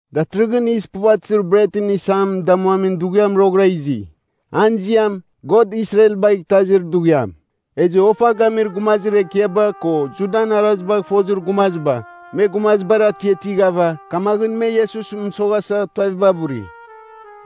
Datɨrɨghɨn Yis Puvatɨzir Bretɨn Isam Damuamin Dughiam roghɨra izi. An ziam, God Israelbagh Itazir Dughiam. Ezɨ ofa gamir gumazir ekiaba, ko Judan arazibagh fozir gumaziba, me gumazibar atiatighava, kamaghɨn me Iesusɨn mɨsoghasa tuaviba buri.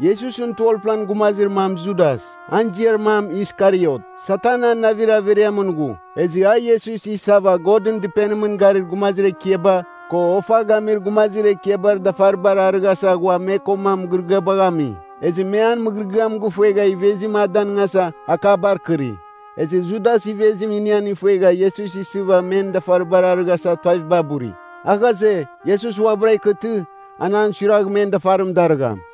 Iesusɨn 12-plan gumazir mam Judas, an ziar mam Iskariot. Satan an navir averiamɨn ghu. Ezɨ a Iesus isava Godɨn Dɨpenimɨn garir gumazir ekiaba, ko ofa gamir gumazir ekiabar dafaribar arɨghasa ghua me koma mɨgɨrɨgɨabagh ami. Ezɨ me an mɨgɨrɨgɨam gifuegha ivezim a danɨngasa, akabar kɨri. Ezɨ Judas ivezim inian ifuegha Iesus isɨva men dafaribar arɨghasa tuaviba buri. A ghaze, Iesus uabɨra ikɨtɨ, an an suiragh men dafarim darɨgham.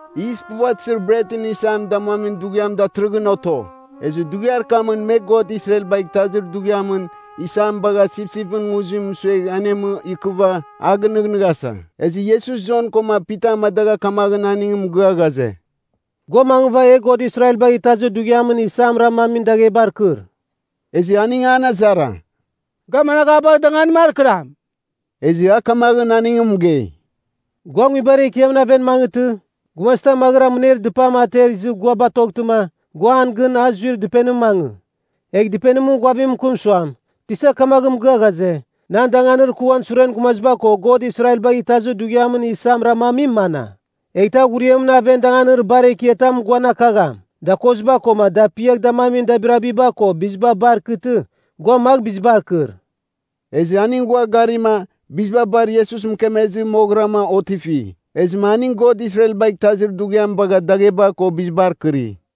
Yis Puvatɨzir Bretɨn Isam Damuamin Dughiam datɨrɨghɨn oto. Ezɨ dughiar kamɨn me God Israelbagh Itazir Dughiamɨn isam bagha sipsipɨn nguzim mɨsuegh anemɨ ikɨva, a gɨnɨghnɨghasa. Ezɨ Iesus Jon koma Pita amadagha kamaghɨn aning mɨgɨa ghaze, “Gua mangɨva e God Israelbagh Itazir Dughiamɨn isam ramamin daghebar kɨr.” Ezɨ aning an azara, “Ga managh a bagh danganim akɨram?” Ezɨ a kamaghɨn aning mɨgei, “Gua nguibar ekiamɨn aven mangɨtɨ, gumazitam maghɨra mɨner dɨpam ater izɨ gua batoghtɨma, gua an gɨn a zuir dɨpenimɨn mangɨ. Egh dɨpenimɨn ghuavim mɨkɨm suam, ‘Tisa kamaghɨn mɨgɨa ghaze, “Nan danganir kɨ uan suren gumaziba ko God Israelbagh Itazir Dughiamɨn isam ramamim mana?” ’ Eghtɨ a ghuriamɨn aven danganir bar ekiatam guan akagham, dakoziba koma dapiagh damamin dabirabiba ko biziba bar ikɨtɨ, gua magh bizibar kɨr.” Ezɨ aning ghua garima, biziba bar Iesus mɨkemezɨ moghɨrama otifi. Ezɨma aning God Israelbagh Itazir Dughiam bagha dagheba ko bizibar kɨri.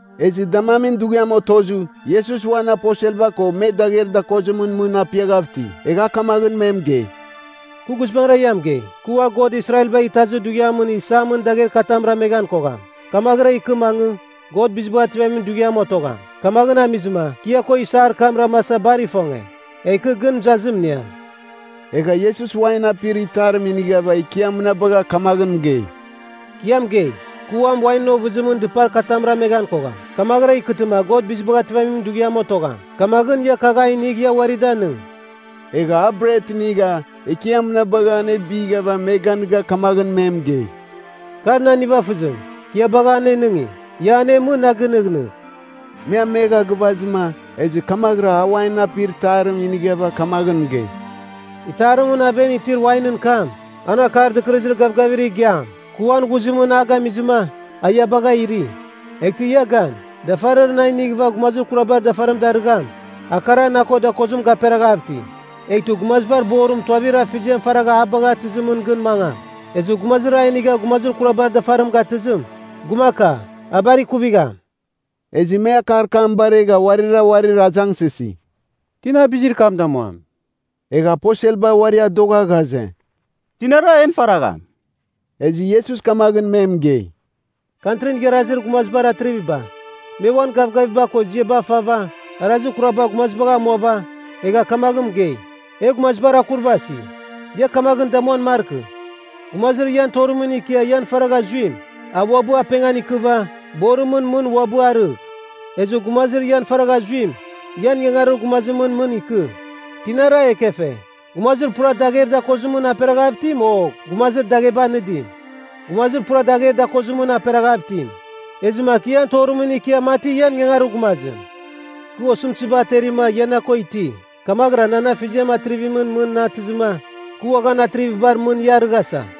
Ezɨ damamin dughiam otozɨ, Iesus uan aposelba ko me dagher dakozimɨn mɨn apiaghav iti. Egha a kamaghɨn me mɨgei, “Kɨ guizbangɨra ia mɨgei, kɨ ua God Israelbagh Itazir Dughiamɨn isamɨn dagher katam rameghan kogham. Kamaghɨra ikɨ mangɨ, God Bizibagh Ativamin Dughiamɨn otogham. Kamaghɨn amizɨma kɨ ia ko isar kam ramasa bar ifonge. Egh kɨ gɨn mɨzazim iniam.” Egha Iesus wain apir itarim inighava Ekiam mɨnabagha kamaghɨn mɨgei, “Kɨ ia mɨgei, kɨ uam wainɨn ovɨzimɨn dɨpar katam raman kogham, kamaghɨra ikɨtɨma God Bizibagh Ativamin Dughiam otogham. Kamaghɨn, ia kagh a inigh ia uari danɨng.” Egha a bret inigha, Ekiam mɨnabagha anebighava me ganɨga kamaghɨn me mɨgei, “Kar nan nivafɨzim, kɨ ia bagha anenɨngi. Ia anemɨ, na gɨnɨghnɨgh.” Me amegha gɨvazɨma, ezɨ kamaghɨra a wainɨn apir itarim inighava kamaghɨn mɨgei, “Itarimɨn aven itir wainɨn kam, an Akar Dɨkɨrɨzir Gavgavir Igiam, kɨ uan ghuzimɨn a gamizɨma, a ia bagha iri. Eghtɨ ia gan, dafarir na inighɨva gumazir kurabar dafarim darɨgham, a kara na ko dakozim gaperaghavtɨ. Eghtɨ Gumazibar Borim tuavir Afeziam faragha a bagh atɨzimɨn gɨn mangam. Ezɨ gumazir a inigha gumazir kurabar dafarim gatɨzim, gumaka, a bar ikuvigham.” Ezɨ me akar kam baregha uarira uarir azangsɨsi, “Tina bizir kam damuam?” Egha aposelba uari adogha ghaze, tinara en faragham? Ezɨ Iesus kamaghɨn me mɨgei, “Kantrin Igharazir Gumazibar atriviba, me uan gavgaviba ko ziaba fava, arazir kuraba gumazibagh amuava, egha kamaghɨn mɨgei ‘E gumazibar akurvasi.’ Ia kamaghɨn damuan markɨ. Gumazir ian torimɨn ikia ian faragha zuim, a uabɨ apengan ikɨva, borimɨn mɨn uabɨ arɨgh. Ezɨ gumazir ian faragha zuim, ian ingangarir gumazimɨn mɨn ikɨ. Tinara ekefe, gumazir pura dagher dakozimɨn aperaghav itim o gumazir dagheba anɨdim? Gumazir pura dagher dakozimɨn aperaghav itim. Ezɨma kɨ ian torimɨn ikia mati ian ingangarir gumazim. “Kɨ osɨmtɨziba aterima ia na ko iti. Kamaghɨra nan afeziam Atrivimɨn mɨn na atɨzɨma, kɨ uaghan atrivibar mɨn ia arɨghasa.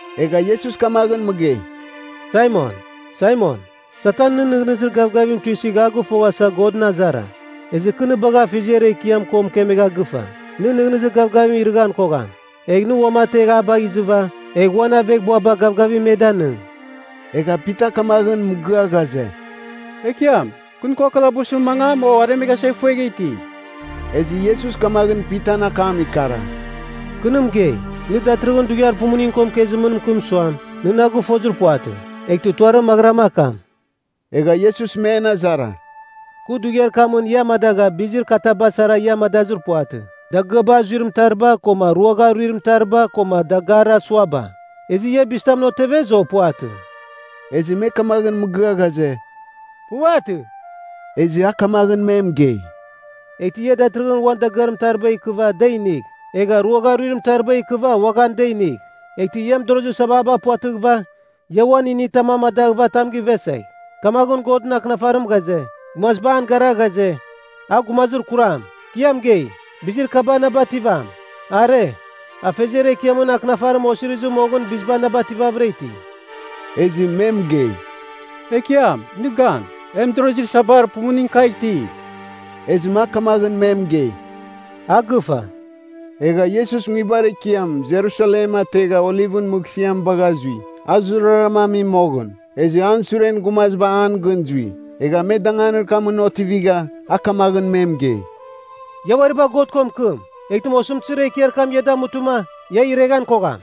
Egha Iesus kamaghɨn mɨgei, “Saimon, Saimon, Satan nɨn nɨghnɨzir gavgavim tuisɨgh a gɨfoghasa, Godɨn azara. Ezɨ kɨ nɨ bagha Afeziar Ekiam ko mɨkemegha gɨfa, nɨn nɨghnɨzir gavgavim irɨghan kogham. Egh nɨ uamategh na bagh izɨva, egh uan aveghbuaba gavgavim me danɨng.” Egha Pita kamaghɨn mɨgɨa ghaze “Ekiam, kɨ nɨ ko kalabusɨn mangam o aremeghasa ifuegha iti.” Ezɨ Iesus kamaghɨn Pitan akam ikara, “Kɨ nɨ mɨgei, nɨ datɨrɨghɨn dughiar pumuning ko mɨkezimɨn mɨkɨm suam, nɨ na gɨfozir puvatɨ, eghtɨ tuarim maghɨrama akam.” Egha Iesus men azara, “Kɨ dughiar kamɨn ia amadagha bizir kataba sara ia amadazɨr puvatɨ, dagɨaba azuir mɨtariba koma ruagha aruir mɨtariba koma dagarir asuaba. Ezɨ ia bizitamɨn otevez o puvatɨ?” Ezɨ me kamaghɨn mɨgɨa ghaze, “Puvatɨ.” Ezɨ a kamaghɨn me mɨgei, “Eghtɨ ia datɨrɨghɨn uan dagɨar mɨtariba ikɨva, da inigh, egha ruagha aruir mɨtariba ikɨva, uaghan da inigh. Eghtɨ ia mɨdorozir sababa puvatɨghɨva, ia uan initam amadaghɨva tam givesegh. Kamaghɨn Godɨn Akɨnafarim ghaze, ‘Gumaziba an gara ghaze, a gumazir kuram.’ Kɨ ia mɨgei, bizir kaba na bativam. Are, Afeziar Ekiamɨn akɨnafarim osirizir moghɨn biziba na bativavɨra iti.” Ezɨ me mɨgei, “Ekiam, nɨ gan. E mɨdorozir sabar pumuning kagh iti.” Ezɨma a kamaghɨn me mɨgei, “A gɨfa.” Egha Iesus nguibar ekiam, Jerusalem, ategha, Olivɨn mɨghsɨam bagha zui. A zurara ami moghɨn. Ezɨ an suren gumaziba an gɨn zui. Egha me danganir kamɨn otivigha a kamaghɨn me mɨgei, “Ia uari bagh God ko mɨkɨm. Eghtɨma osɨmtɨzir ekiar kam ia damutɨma, ia ireghan kogham.”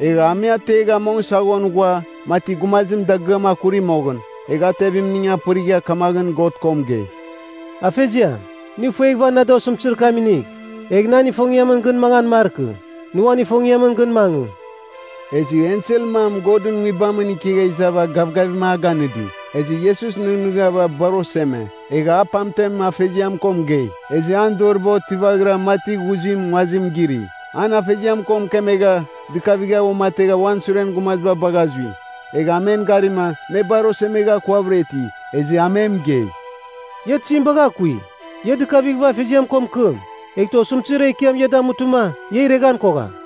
Egha a me ategha mong saghon ghua, mati gumazim dagɨam akuri moghɨn, egha a tevimning apɨrigha kamaghɨn God ko mɨgei, “Afeziam, nɨ ifueghava na da osɨmtɨzir kam inigh. Egh nan ifongiamɨn gɨn mangan markɨ. Nɨ uan ifongiamɨn gɨn mangɨ.” Ezɨ ensel mam Godɨn Nguibamɨn ikegha izava gavgavim a ganɨdi. Ezɨ Iesus nɨghnɨghava bar oseme, egha a pamtem Afeziam ko mɨgei. Ezɨ an doriba otivaghira mati ghuzim nguazim giri. An Afeziam ko mɨkemegha, dɨkavighava uamategha uan suren gumaziba bagha zui. Egha a men garima, me bar osemeghava akuavɨra iti. Ezɨ a me mɨgei, “Ia tizim bagha akui? Ia dɨkavighɨva Afeziam ko mɨkɨm. Eghtɨ osɨmtɨzir ekiam ia damutɨma, ia ireghan kogham.”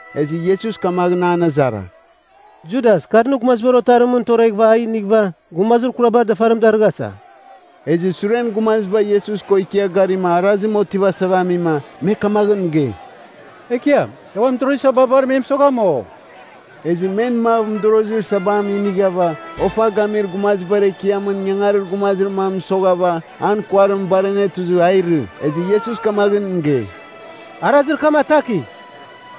Ezɨ Iesus kamaghɨn an azara, “Judas kar nɨ Gumazibar Otarimɨn toreghɨva a inighɨva, gumazir kurabar dafarim darɨghasa?” Ezɨ suren gumaziba Iesus ko ikia garima arazim otivasava amima, me kamaghɨn mɨgei, “Ekiam, e uan mɨdorozir sababar me mɨsogham, o?” Ezɨ men mav mɨdorozir sabam inighava, ofa gamir gumazibar ekiamɨn ingangarir gumazir mam mɨsoghava, an kuarim bar anetuzɨ a irɨ. Ezɨ Iesus kamaghɨn mɨgei, “Arazir kam atakigh!”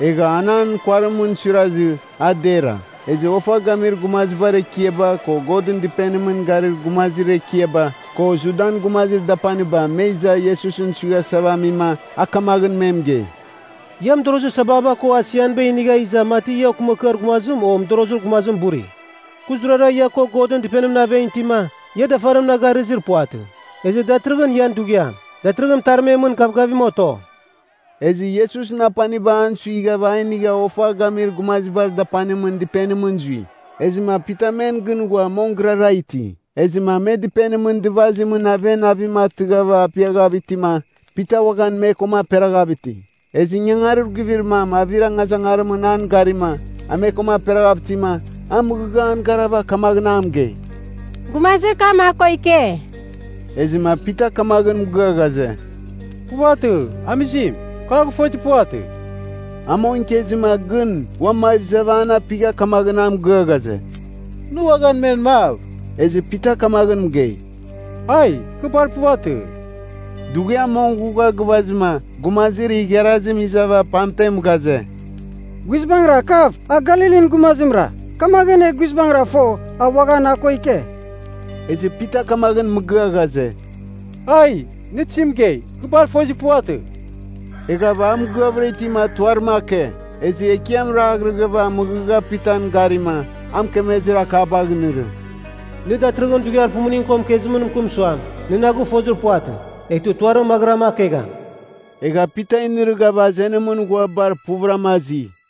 Egha an an kuarimɨn suirazɨ, a dera. Ezɨ ofa gamir gumazibar ekiaba, ko Godɨn Dɨpenimɨn garir gumazir ekiaba, ko Judan gumazir dapaniba me iza Iesusɨn suighasava amim, a kamaghɨn me mɨgei, “Ia mɨdorozir sababa ko asianiba inigha iza mati ia okɨmakɨar gumazim o mɨdorozir gumazim buri? Kɨ zurara ia ko Godɨn Dɨpenimɨn aven itima, ia dafarim na garɨzir puvatɨ. Ezɨ datɨrɨghɨn ian dughiam. Datɨrɨghɨn mɨtarmemɨn gavgavim oto.” Ezɨ Iesusɨn apaniba an suighava a inigha ofa gamir gumazibar dapanimɨn dɨpenimɨn zui. Ezɨma Pita men gɨn ghua mong gɨrara iti. Ezɨma me dɨpenimɨn dɨvazimɨn aven avim atɨghava apiaghav itima, Pita uaghan me koma aperaghav iti. Ezɨ ingangarir guivir mam avir angazangarimɨn an garima, a me koma aperaghav itima, a mɨghɨgha an garava kamaghɨn a mɨgei, “Gumazir kam a ko ike.” Ezɨma Pita kamaghɨn mɨgɨa ghaze, “Puvatɨ! Amizim, kɨ a gɨfozir puvatɨ.” A mong ikezɨma gɨn ua mav izava an apigha kamaghɨn a mɨgɨa ghaze, “Nɨ uaghan men mav.” Ezɨ Pita kamaghɨn mɨgei, “Ai! Kɨ bar puvatɨ!” Dughiam mong ghugha gɨvazɨma, gumazir igharazim izava pamtem ghaze, “Guizbangɨra kav, a Galilin gumazimra. Kamaghɨn e guizbangɨra fo, a uaghan a ko ike.” Ezɨ Pita kamaghɨn mɨgɨa ghaze, “Aiee! Nɨ tizim mɨgei? Kɨ bar fozir puvatɨ!” Eghava a mɨgɨavɨra itima tuarim ake. Ezɨ Ekiam raghrɨghava mɨghɨgha Pitan garima, a mɨkemezir akabagh inɨrɨ, “Nɨ datɨrɨghɨn dughiar pumuning ko mɨkezimɨn mɨkɨm suam, ‘Nɨ na gɨfozir puvatɨ,’ eghtɨ tuarim maghɨrama akegham.” Egha Pita inɨrɨghava azenimɨn ghua bar puvɨrama azi.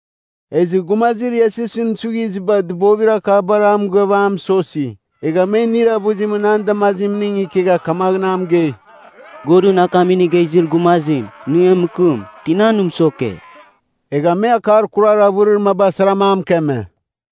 Ezɨ gumazir Iesusɨn suighiziba dɨbovir akabar a mɨgɨava a mɨsosi. Egha me inir avɨzimɨn an damazimning ikegha kamaghɨn a mɨgei, “Godɨn akam inigha izir gumazim, nɨ e mɨkɨm! Tina nɨ mɨsoke?” Egha me akar kurar avɨrir maba saram a mɨkeme.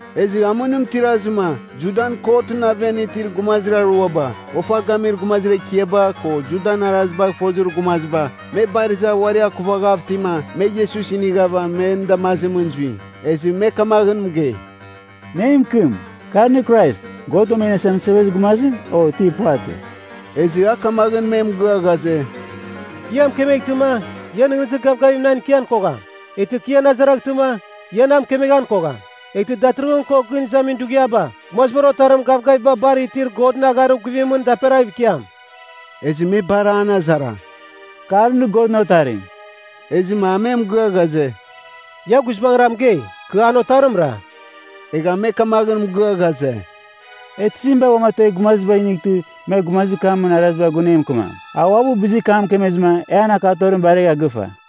Ezɨ amɨnim tirazɨma, Judan kotɨn aven itir gumazir aruaba (ofa gamir gumazir ekiaba, ko Judan arazibagh fozir gumaziba) me bar iza uari akuvaghav itima, me Iesus inighava men damazimɨn zui. Ezɨ me kamaghɨn mɨgei, “Nɨ e mɨkɨm, kar nɨ Krais, God Uam E Iniasa Mɨsevezir Gumazim, o ti puvatɨ?” Ezɨ, a kamaghɨn me mɨgɨa ghaze, “Kɨ ia mɨkemeghtɨma, ia nɨghnɨzir gavgavim nan ikian kogham. Eghtɨ kɨ ian azaraghtɨma, ia na mɨkemeghan kogham. Eghtɨ datɨrɨghɨn ko gɨn izamin dughiaba, Gumazibar Otarim gavgaviba bar itir Godɨn agharir guvimɨn daperaghɨv ikiam.” Ezɨ me bar an azara, “Kar nɨ Godɨn Otarim?” Ezɨma a me mɨgɨa ghaze, “Ia guizbangɨra mɨgei, kɨ an Otarimra.” Egha me kamaghɨn mɨgɨa ghaze, “E tizim bagh uamategh gumaziba inightɨ me gumazir kamɨn arazibar gun e mɨkɨmam? A uabɨ bizir kam mɨkemezɨma e an akatorim baregha gɨfa.”